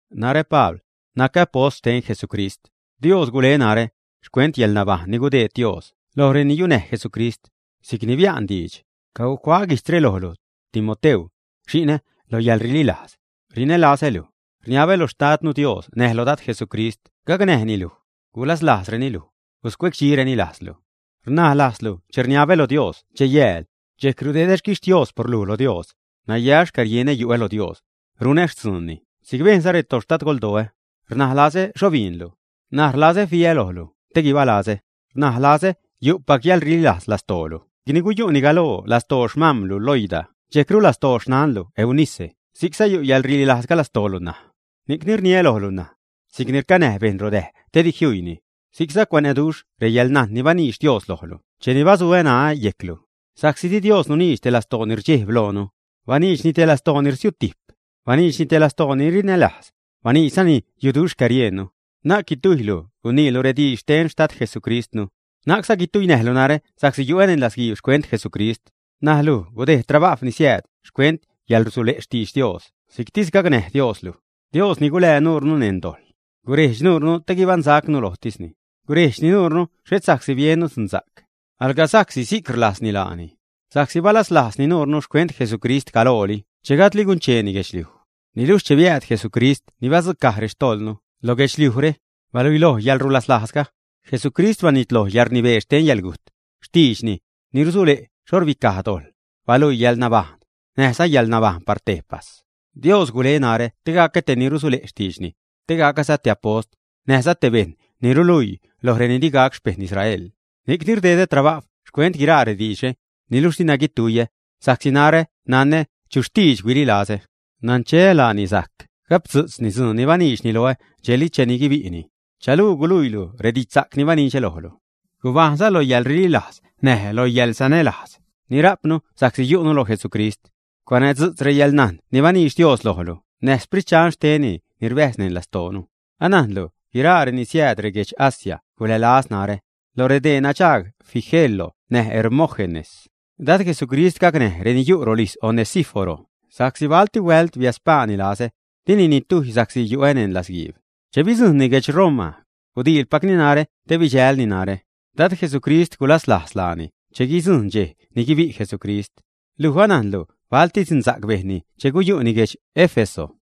Narä Pabl, nacä apost xten Jesucrist. Dios gule narä, xcuent yäḻnabajṉ ni gudeed Dios loj reni yunäj Jesucrist, si'c ni bia'n diidx. Cacuaä guijtzre lojlu, Timoteu, xi'nä lo yäḻrililajz. Rinälazä luj. Rniabä lo Xtadnu Dios näj lo Dad Jesucrist gacnäj luj, gulaslajzreni luj, guscuecdxireni lajzlu. Rnaj lazälu che rniabä lo Dios dxej-yääl. Dxejc rdedä xquixtios por luj lo Dios. Naya xcärienä yu'ä lo Dios, runä xtzuunni si'c bejnza rextadgoldoä. Rnaj lazä xho biinlu, ṉaj rlazä fiä lojlu te guibalazä. Rnaj lazäza yu'pac yäḻrililajz lastoolu si'cni guyu'ni galoo lastoo xmam̲lu Loida dxejcru lastoo xnanlu Eunice si'cza yu' yäḻrililajzga lastoolu ṉaj. Ni'cni rniä lojlu ṉaj, si'cni rcanäj bejṉ rodäj te di juiini, si'cza cuanäduxh reyäḻnajn ni baniidx Dios lojlu cheni basuä ṉaä yejclu. Sa'csi di Dios nuniidx te lastoo ni rdxejb loonu, baniidxni te lastoo ni rsiutijp, baniidxni te lastoo ni rinälajz, baniidxzani yuduxh xcäriejnnu. Na'c guitujylu guiniilu rediidx xten Xtad Jesucristnu, na'cza guituinäjlu narä sa'csi yu'ä neṉ latzguiib xcuent Jesucrist. Näj luj gudejd trabajw ni siääd xcuent yäḻrusule' xtidx Dios si'ctis gacnäj Dios luj. Dios ni gulää nurnu neṉ dojḻ, gurejdx nurnu te guibaṉsa'cnu lojtisni. Gurejdxni nuurnu xhet sa'csi biennu dzuṉsa'c, alga sa'csi si'c rlajzni laani, sa'csi balaslajzni nuurnu xcuent Jesucrist galooli che gajdli guncheeni guedxliuj. Niluxh cheni biääd Jesucrist ni badzucaj rextojḻnu lo guedxliujre, baluiloj yäḻrulaslajzga. Jesucrist banitloj yäḻrnibee xten yäḻgujt. Xtiidxni, ni rusule' xho rbicaj dojḻ, baluii yäḻnabajṉ, näjza yäḻnabajṉ par tejpas. Dios gule narä te gacä te ni rusule' xtiidxni, te gacäza te apost, näjza te bejṉ ni ruluii loj reni di gac xpejṉ Israel. Ni'cni rdedä trabajw xcuent guiraa rediidxre. Niluxh dina guituiyä, sa'csi narä nanä chu xtiidx huililazä, nancheä laani sajc gapdzu'tzni dzuun ni baniidxni loä dxejli cheni guibi'ni. Chanuu guluiilu redidxsa'c ni banidxä lojlu. Gubajṉza lo yäḻrililajz näj lo yäḻsanälajz ni rajpnu sa'csi yu'nu lo Jesucrist. Cuanädzu'tz reyäḻnajn ni baniidx Dios lojlu näj Sprit Dxan xtenni ni rbäjz neṉ lastoonu. Anajnlu guiraa reni siääd reguedx Asia gulälaz narä; lo redee nadxaag Figelo näj Hermógenes. Dad Jesucrist gacnäj reni yu' rolijz Onesíforo sa'csi balti huält biädspaani lazä, dini nitujy sa'csi yu'ä neṉ latzguiib. Che bidzujṉni guedx Roma, gudiilpacni narä te bidxälni narä. Dad Jesucrist gulaslajz laani che guidzujṉ dxej ni guibi' Jesucrist. Luj anajnlu balti dzunsa'c bejnni che guyu'ni guedx Éfeso.